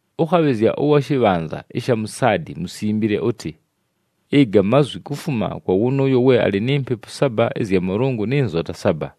“Ʉkhabhɨzya ʉwa shɨbhanza ɨsha mu Saadi musimbile ʉtɨ: Ɨga mazwi kufuma kwa wʉnʉʉyo we alɨ ni Mpepu saba ɨzya Mʉlʉngʉ nɨ nzota saba.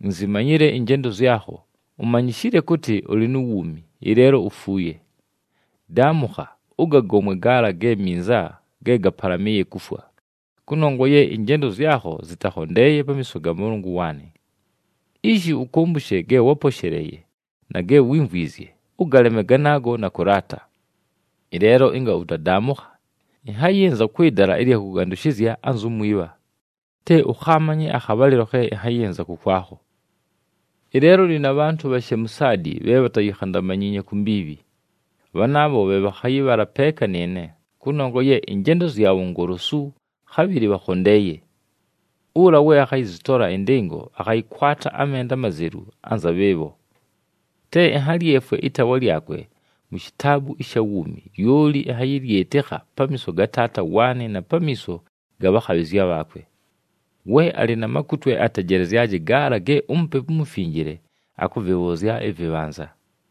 Inzimanyile ɨnjendo zyakho, umanyishile kʉtɨ ʉlɨ nu wuumi, ɨleelo ufuuye. Daamʉkha! Ʉgagomwe gaala ge minza ge gapalamɨɨye kufwa, kʉnongwa ye ɨnjendo zyakho zɨtakhondeeye pamiiso ga Mʉlʉngʉ waanɨ. Ishi, ʉkʉmbʉshe ge wáposheleeye na ge wímvwizye, ʉgaleme ganaago na kʉlaata. Ɨleelo ɨnga ʉtadaamʉkha, ɨnhayɨnza kwɨ dala ɨlya kʉgandʉshɨzya anzu mwibha, te ʉkhaamanye akhabhalɨlo khe ɨnhayɨnza kʉkwakho. Ɨleelo ʉlɨ na bhantʉ bhashe mu Saadi bhe bhatayikhandamanyiinye ku mbiibhi. Bhanaabho bhe bhakhayɨbhala peeka nɨɨne, kʉnongwa ye ɨnjendo zyabho ngolosu, khabhɨlɨ bhakhondeeye. Ʉla we akhayɨzɨtola ɨndɨngo, akhayɨkwata amenda amazelu anza bhɨɨbho. Te ɨnhalyefwe ɨtaawa lyakwe mu shitaabu ɨsha wuumi, lyoli ɨnhayɨlyɨtɨkha pamiiso ga Taata waanɨ na pamiiso ga bhakhabhɨzya bhaakwe. We alɨ na makutwe atejelezyaje gaala ge uMupepu uMufinjile akʉvɨbhʉʉzya ɨvɨbhanza.”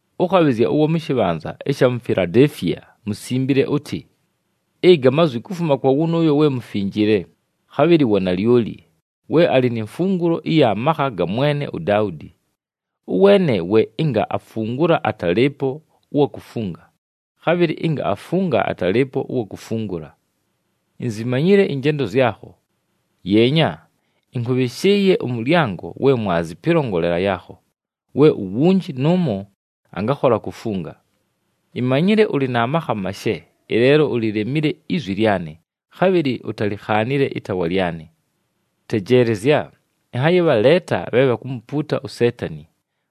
“Ʉkhabhɨzya ʉwa shɨbhanza ɨsha mu Filadeefiya musimbile ʉtɨ: Ɨga mazwi kufuma kwa wʉnʉʉyo we mufinjile, khabhɨlɨ wa nalyoli, we alɨ ni mfungulo ɨya makha ga mwene uDaudi. Ʉweene we ɨnga afungula atalɨɨpo ʉwa kufunga, khabhɨlɨ ɨnga afunga atalɨɨpo ʉwa kufungula. Inzimanyile ɨnjendo zyakho. Yeenya, ɨnkʉbhɨshɨɨye ʉmʉlyango we mwazi pɨlongolela yaakho, we uwunji nʉʉmo angakhola kufunga. Imanyile ʉlɨ na makha mashe, ɨleelo ulilemile izwi lyanɨ, khabhɨlɨ utalikhaanile ɨtaawa lyanɨ. Tejeelezya, ɨnhayɨbhaleeta bhe bhakumupuuta uSeetani,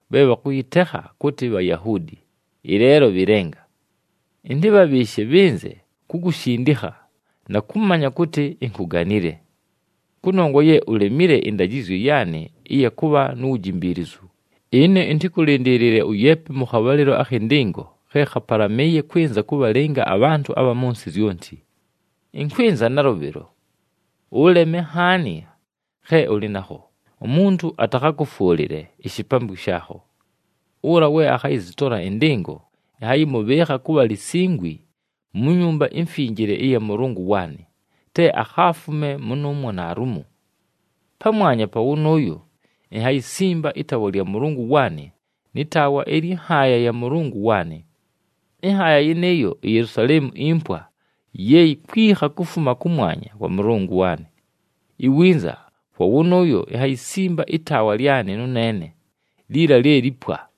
bhe bhakʉyɨtekha kʉtɨ Bhayahuudi, ɨleelo bhɨ lenga. Ɨntɨbhabhɨɨshe bhɨnze kukushindikha na kʉmanya kʉtɨ inkuganile. Kʉnongwa ye ulemile ɨndajɨzyo yaanɨ ɨya kʉbha nu wujimbiilizu, ɨne ɨntɨkʉlɨndɨɨlɨle ʉyeepe mʉ khabhalɨlo akhɨ ndɨngo khe khapalamɨɨye kwɨnza kʉbhalɨnga abhantʉ abha mʉ nsɨ zyonti. Ɨnkwɨnza nalʉbhɨlo. Ʉleme nhaani khe ʉlɨ nakho, umuntu atakhakʉfwʉlɨle ishipambwi shaakho. Ʉla we akhayɨzɨtola ɨndɨngo, ɨnhayɨmʉbhɨɨkha kʉbha lisingwi mu Nyumba iMfinjile ɨya Mʉlʉngʉ waanɨ, te akhaafume mʉnʉʉmwo naalumo. Pamwanya pa wʉnʉʉyo, inhayisimba ɨtaawa lya Mʉlʉngʉ waanɨ nɨ taawa ɨlyɨ nhaaya ya Mʉlʉngʉ waanɨ. Ɨnhaaya yɨnɨɨyo iYelusaleemu impwa ye yikwikha kufuma kʉmwanya kwa Mʉlʉngʉ waanɨ. Iwinza kwa wʉnʉʉyo inhayisimba ɨtaawa lyanɨ nʉneene, liila lye lipwa.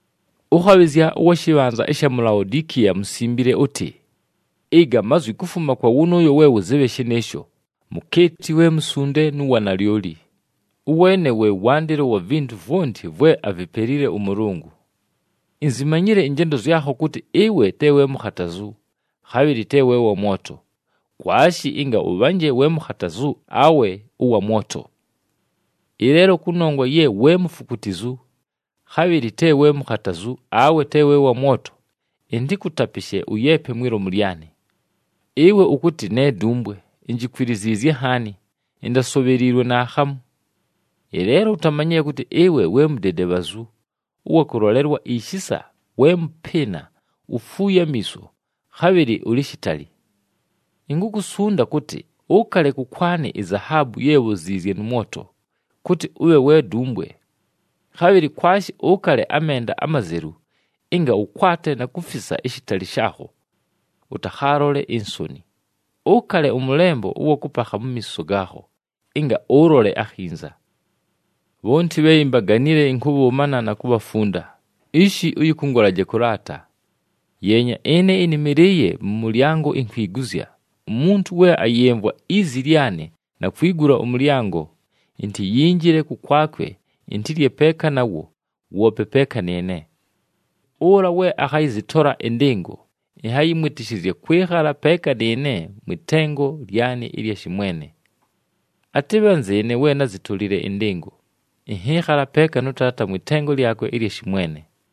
“Ʉkhabhɨzya ʉwa shɨbhanza ɨsha mu Laodikiya musimbile ʉtɨ: Ɨga mazwi kufuma kwa wʉnʉʉyo we Wʉzɨbhe Shɨnɨɨsho, mukeeti we musunde nʉ wa nalyoli, ʉweene we wandɨlo wa vintu vwonti vwe avipelile ʉMʉlʉngʉ. Inzimanyile ɨnjendo zyakho kʉtɨ ɨwe te we mukhatazu, khabhɨlɨ te we wa mwoto. Kwashi ɨnga ʉbhanje we mukhatazu awe ʉwa mwoto! Ɨleelo kʉnongwa ye we mufukutizu, khabhɨlɨ te we mukhatazu awe te we wa mwoto, ɨntɨkʉtapɨshe ʉyeepe mwi lomu lyanɨ. Ɨwe ʉkʉtɨ, ‘Ne dumbwe, injikwiliziizye nhaani, intasobheliilwe naakhamu.’ Ɨleelo utamanyile kʉtɨ ɨwe we mudedebhazu, ʉwa kʉlolelwa ishisa, we mʉpɨɨna, ufuuye amiiso, khabhɨlɨ ʉlɨ shitali. Inkukusunda kʉtɨ, ʉkale kʉkwanɨ izahaabu ye bhoziizye mʉ mwoto, kʉtɨ ʉbhe we dumbwe. Khabhɨlɨ kwashi ʉkale amenda amazelu, ɨnga ʉkwate na kufisa ishitali shaakho, ʉtakhaalole insoni. Ʉkale ʉmʉlembo ʉwa kʉpakha mu miiso gaakho ɨnga ʉlole akhinza. Bhonti bhe imbaganile, ɨnkʉbhʉʉmana na kubhafunda, ishi ʉyɨkʉngʉlaje kʉlaata. Yeenya, ɨne ɨnɨmɨlɨɨye mʉ mʉlyango inkwiguzya. Umuntu we ayɨmvwa izi lyanɨ na kwigula ʉmʉlyango, intiyinjile kʉkwakwe, intilye peeka nawo, woope peeka nɨɨne. Ʉla we akhayɨzɨtola ɨndɨngo, ɨnhayɨmwɨtɨshɨzya kwɨkhala peeka nɨɨne mwɨ tengo lyanɨ ɨlya shɨmwene. Atɨbhe anzɨɨne we názitolile ɨndɨngo, ɨnhɨɨkhala peeka nʉ Taata mwɨ tengo lyakwe ɨlya shɨmwene.